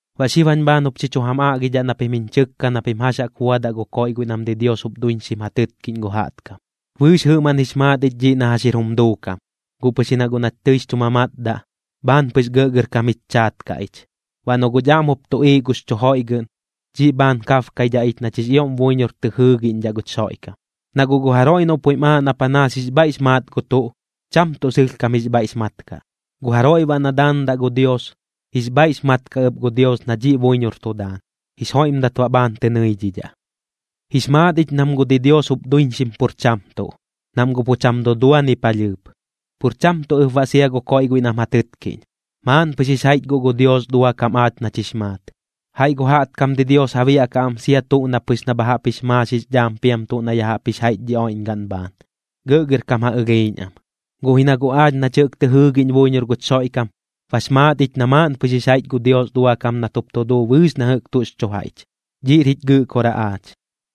Baꞌ xib jañ bhaan jup xi chu jam aꞌgidhaꞌ na pim jiñ chɨkka na pim jax jaꞌk buadaꞌ gu koiꞌ guiꞌ nam didios jup duiñxim ja tɨtkiꞌñ gu jaꞌtkam. Bɨɨx jɨꞌmaꞌn jix maat ich dhiꞌ na jax jir jum duukam, guꞌ pɨx ji na guꞌ nach tɨix chu mamatdaꞌ, bhaan pɨx gɇꞌgɇrkam jich chaat kaꞌ ich. Baꞌ noꞌ guꞌch aꞌm jup tuꞌiiꞌ gux chu joiꞌgɨꞌn, dhiꞌ bhaan kabkaidhaꞌ ich nach jix ioꞌm buiñor tɨ jɨɨgiꞌñdhaꞌ guch Xoiꞌkam. Na guꞌ gu jaroiꞌ noꞌ puiꞌm aaꞌ na panaas jix bhaiꞌx maat gu tuꞌ, cham tuꞌ sɨlhkam jix bhaiꞌx mat kaꞌ. Gu jaroiꞌ baꞌ na daandaꞌ gu Dios, jix bhaiꞌx mat kaꞌ ɨp gu Dios na dhiꞌ buiñor tu daan, jix joiꞌmdat baꞌ bhaan tɨ nɨidhidhaꞌ. Jix maat ich nam gu didios jup duiñxim pur cham tuꞌ, nam guꞌ pu cham dudua ni palhɨɨp, pur cham tuꞌ ɨp baꞌ sia gu koiꞌ guiꞌ nam ja tɨtkiꞌñ. Maaꞌn pɨx jix jaiꞌch guꞌ gu Dios duakam aach nach jix maat. Jaiꞌ gu jaꞌtkam didios ja biaꞌkaꞌ am sia tuꞌ na pɨx na bha jaꞌp jix maax jix dhaam piam tuꞌ na ya jaꞌp jix jaiꞌch dhi oiꞌñgaꞌn bhaan, gɇꞌgɇrkam ja ɨlhiiꞌñ am. Guꞌ ji na guꞌ aach nach jɨꞌk tɨ jɨɨgiꞌñ buiñor guch Xoiꞌkam, bax maat ich na maaꞌn pɨx jix jaiꞌch gu Dios duakam nat jup tu duu bɨɨx na jɨꞌk tuꞌx chu jaiꞌch, dhiꞌr jich Gɨꞌkoraꞌ aach.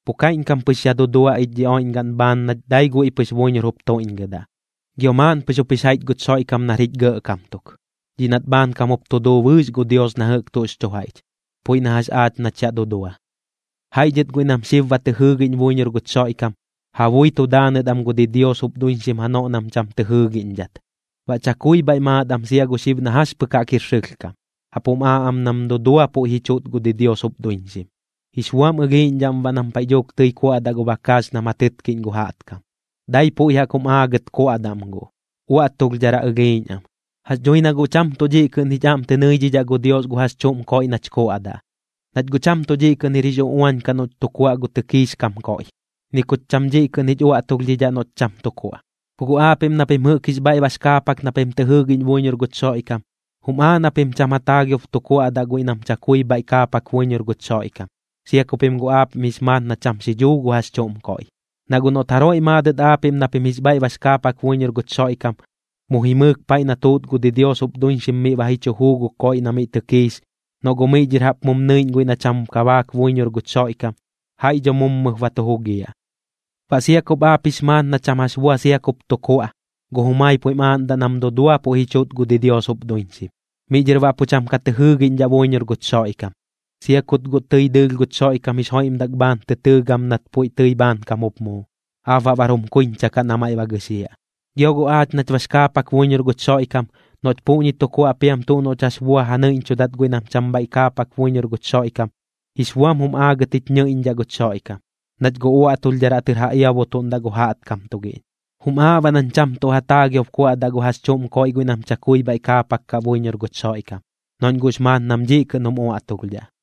Pu kaiꞌñkam pɨx yaꞌ dudua ich dhi oiꞌñgaꞌn bhaan nach dai guiꞌ pɨx buiñor jup tuiꞌñgɨdaꞌ. Gio maaꞌn pɨx jup jix jaiꞌch guch Xoiꞌkam nar jich Gɇꞌkam tuk, dhiꞌ nat bhaankam jup tu duu bɨɨx gu Dios na jɨꞌk tuꞌx chu jaiꞌch, puiꞌ na jax aach nach yaꞌ dudua. Jaiꞌ dhɨt guiꞌ nam xib ba tɨ jɨɨgiꞌñ buiñor guch Xoiꞌkam, ja bui tu daanɨt am gu didios jup duiñxim janoꞌ nam cham tɨ jɨɨgiꞌñdhat, baꞌ chakui bhaiꞌ maat am sia gu xib na jax pɨk jaꞌk jir sɨlhkam. Jaꞌp jum aaꞌ am nam dudua puiꞌ ji chuꞌt gu didios jup duiñxim, jix buam ɨlhiiꞌñdhaꞌm baꞌ nam paiꞌ dhuuk tɨi kuaꞌdaꞌ gu bakaax nam ja tɨtkiꞌñ gu jaꞌtkam, dai puiꞌ jaꞌk jum aagɨt kuaꞌdaꞌm guꞌ, uaꞌtulhdharaꞌ ɨlhiiꞌñ am. Jax dhui na guꞌ cham tuꞌ dhiꞌ kɨꞌn jich aꞌm tɨ nɨidhidhaꞌ gu Dios gu jax chuꞌm koiꞌ nach kuaꞌdaꞌ. Nach guꞌ cham tuꞌ dhiꞌ kɨꞌn jir jix uꞌuañ kaꞌ noꞌch tu kuaꞌ gu tɨkiix kam koiꞌ, ni kuch cham dhiꞌ kɨꞌn jich uaꞌtulhdhidhaꞌ noꞌch cham tu kuaꞌ. Ku guꞌ aapiꞌm na pim jɨꞌk jix bhaiꞌ bax kaapak na pim tɨ jɨɨgiꞌñ buiñor guch Xoiꞌkam, jum aaꞌ na pim cham ja taagiob tu kuaꞌdaꞌ guiꞌ nam chakui bhaiꞌ kaapak buiñor guch Xoiꞌkam, sia ku pim guꞌ aapiꞌm jix maat na cham xidhuu gu jax chuꞌm koiꞌ. Na guꞌ noꞌt jaroiꞌ maadɨt aapiꞌm na pim jix bhaiꞌ bax kaapak buiñor guch Xoiꞌkam, mu jimɨɨk paiꞌ nam tuut gu didios jup duiñxim miꞌ ba ji chu juu gu koiꞌ na miꞌ tɨkiix, noꞌ guꞌ miꞌ dhɨr jaꞌp mum nɨiꞌñ guiꞌ na cham kabaak buiñor guch Xoiꞌkam, jaiꞌ dho mummɨp ba tu jugiaꞌ. Baꞌ sia kup aap jix maat na cham jax bua sia kup tu kuaꞌ, gu jumai puiꞌm aaꞌndaꞌ nam dudua puiꞌ ji chuꞌt gu didios jup duiñxim, miꞌ dhɨr baꞌ pu cham ka tɨ jɨɨgiꞌñdhaꞌ buiñor guch Xoiꞌkam, sia kut guꞌ tɨi dɨɨlh guch Xoiꞌkam jix joiꞌmdak bhaan tɨ tɨɨ gam nat puiꞌ tɨi bhaankam jup muu. Aap baꞌ bar jum kuiñcha kaꞌ na maiꞌ ba gɨxiaꞌ. Gio guꞌ aach nach bax kaapak buiñor guch Xoiꞌkam, noꞌch puꞌñi tu kuaꞌ piam tuꞌ noꞌch jax bua ja nɨiꞌñchudat guiꞌ nam cham bhaiꞌ kaapak buiñor guch Xoiꞌkam, jix buam jum aagɨt jich ñɨiꞌñdhaꞌ guch Xoiꞌkam, nach guꞌ uaꞌtulhdharaꞌ tɨr ja iabutuꞌndaꞌ gu jaꞌtkam tugiꞌñ. Jum aaꞌ baꞌ nañ cham tuꞌ ja taagiob kuaꞌdaꞌ gu jax chuꞌm koiꞌ guiꞌ nam chakui bhaiꞌ kaapak kaꞌ buiñor guch Xoiꞌkam, noꞌñ guꞌx maat nam dhiꞌ kɨꞌn jum uaꞌtulhdhaꞌ.